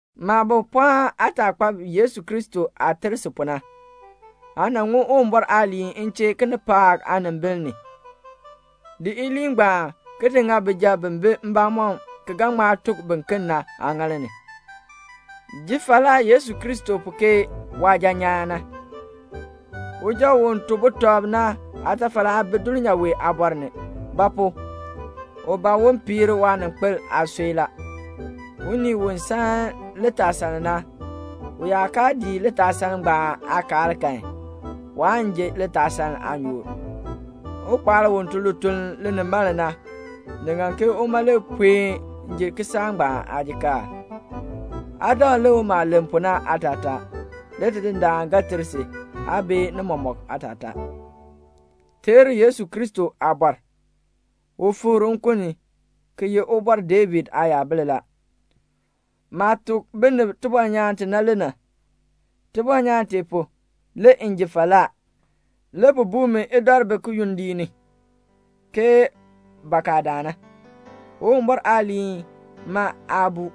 Maabo, pɔɔn aataakpab Yesu Kristo aah ter si pu na. Aa nan ŋun Uwumbɔr aaliin m chee kinipaak aanimbil ni. Di iliin ngbaan ki di ŋa bijab bi bi mbamɔm ki ga ŋma tuk biken na aaŋaal ni. Ji falaa Yesu Kristo pu ke waasuja nyaan na. Suja u to butɔb na aatafal aa bi dulnyaa wee aabɔr ni; ba pu? u ban un piir waaninkpil aasui la. Unii u san litaasaln na, u yaa kaa dii litaasaln ngbaan aakaal kan, waan ji litaasaln aanyoor. Ukpaal u tun lituln linimaln na, ni ŋan ke uma le puen ji kisaak ngbaan aajikaar. Aa dakl lik maah len pu na aatataa, le Tidindaan ga ter si aa bee ni mɔmɔk aatataa. Teer Yesu Kristo aabɔr. U fikr nkun ni, ki ye Ubɔr David aayabil la. Maah tuk binib tibɔnyaan ti na le na. Tibɔnyaan tee pu, le m ji falaa. Le bi buu mi idɔribi kiyondiik ni, ke bakadaan na. Uwumbɔr aaliin ma aa buu.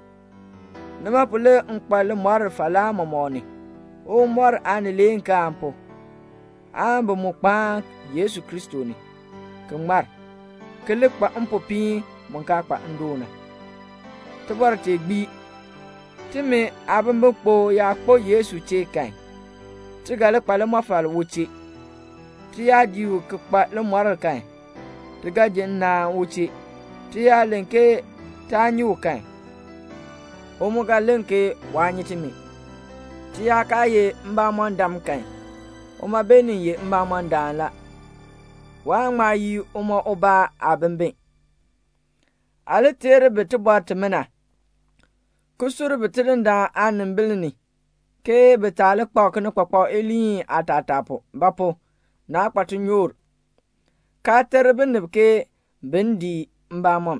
Nima pu le m kpa limɔr falaa mɔmɔk ni, Uwumbɔr aanileekaan pu, aan bi mu kpaan Yesu Kristo ni, ki ŋmar, ki li kpa mpopiin mu kaa kpa ndoon na. Tibɔr tee gbii: "Timi aabimbikpok yaa kpo Yesu chee kan, ti ga li kpa limɔfal u chee. Ti yaa dii u ki kpa limɔr kan, ti ga ji nnaan u chee. Ti yaa len ke taa nyi u kan, u mu ga len ke waa nyi timi. Ti yaa kaa ye mbamɔndam kan, uma beenin ye mbamɔndaan la, waan ŋma yii uma ubaa aabimbin." Aa li teer bi tibɔr timina, ki sur bi Tidindaan aanimbil ni ke bi taa li kpak kinikpakpak iliin aatataa pu; ba pu? naa kpa tinyoor, kaa ter binib ke bin dii mbamɔm.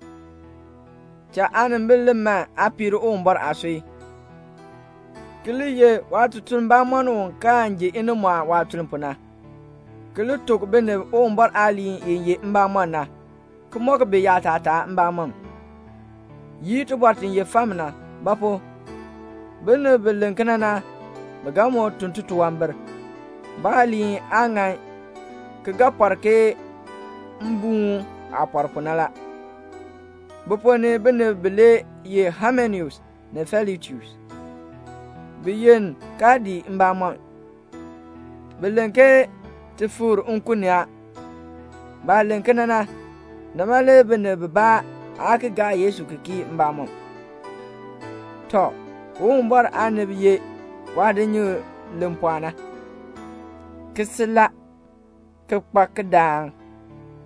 Cha aanimbil li man aa piir Uwumbɔr aasui, ki li ye waatutuln bamɔnn u kaan ji inimɔɔn waatuln pu na, ki tuk binib Uwumbɔr aaliin i ye mbamɔn na, ki mɔk bi yaatataa mbamɔm. Yii tibɔr ti ye fam na; ba pu? binib bi len kena na, bi ga moo tun titunwambir. Baaliin aa ŋan ki ga pɔr ke mbuun aah pɔr pu na la. Bi ponn ni binib bilee ye Haimeneus ni Filetus. Bi yenn kaa dii mbamɔn. Bi len ke ti fikr nkun ni a. Baah len kena na, nima le binib bibaa aa ki gaa Yesu ki kii mbamɔm. Tɔ, Uwumbɔr aanib ye waadinyikl li pɔɔ na, ki sil la, ki kpa kidaan.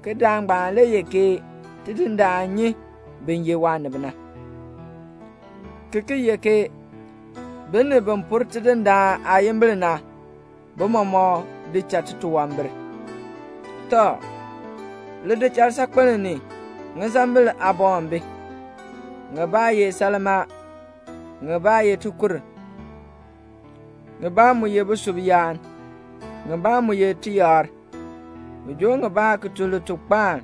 Kidaan ngbaan le ye ke "Tidindaan nyi bin ye waanib na," ki ki ye ke "Binib bi pur Tidindaan aayimbil na, bi mɔmɔk di cha titunwambir." Tɔ, lidichasaakpel ni, ŋisambil aaboŋ bi. Ŋibaa ye salmaa, ŋibaa ye aansilfa, ŋibaa mu ye busub yaan, ŋibaa mu ye tiyakr. Bi joo ŋibaa ki tun litukpaan,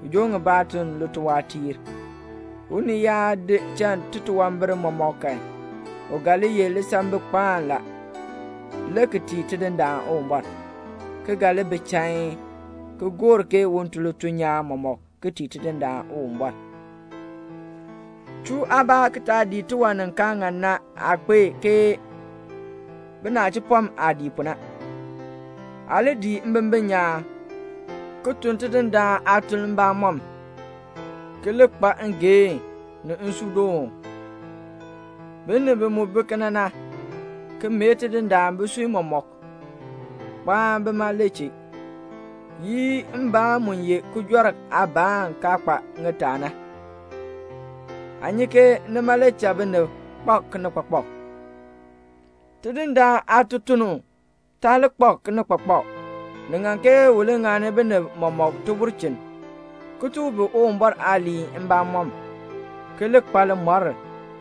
ki joo ŋibaa ki tun lituwaatiir. Unii yaa di cha titunwambir mɔmɔk kan, u ga li ye lisambikpaan la, le ki tii Tidindaan Uwumbɔr, ki ga li bi chain, ki gor ke un tun lituln nyaan mɔmɔk ki tii Tidindaan Uwumbɔr. Chuu aabaa ki taa dii tiwan ni kaa ŋan na aakpeek ke binachipɔm aah dii pu na. Aa li dii mbimbin nyaan, ki tun Tidindaan aatuln mbamɔm, ki li kpa ngeehn, ni nsuudoon. Binib bi mu bi kena na, ki mee Tidindaan bisui mɔmɔk, kpaan bima le chee. Yii mbaan mu ye kijɔrk aabaan kaa kpa ŋitaa na. Aa nyi ke nima le cha binib kpak kinikpakpak. Tidindaan aatutuln taa li kpak kinikpakpak. Ni ŋan ke u li ŋani binib mɔmɔk tibulchin, ki tuk bi Uwumbɔr aaliin mbamɔm, ki li kpa limɔr,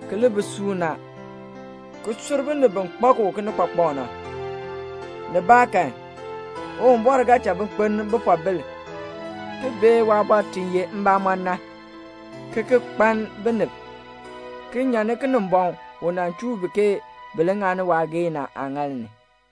ki li bi suuna, ki sur binib bi kpak u kinikpakpak na. Nibaakan Uwumbɔr ga cha bi kpeln bipoobil ki bee waabɔr ti ye mbamɔn na, ki ki kpaln binib, ki nyan ni Kinimbɔŋ u nan chuu bi ke bin ŋani waageehn na aaŋaal ni.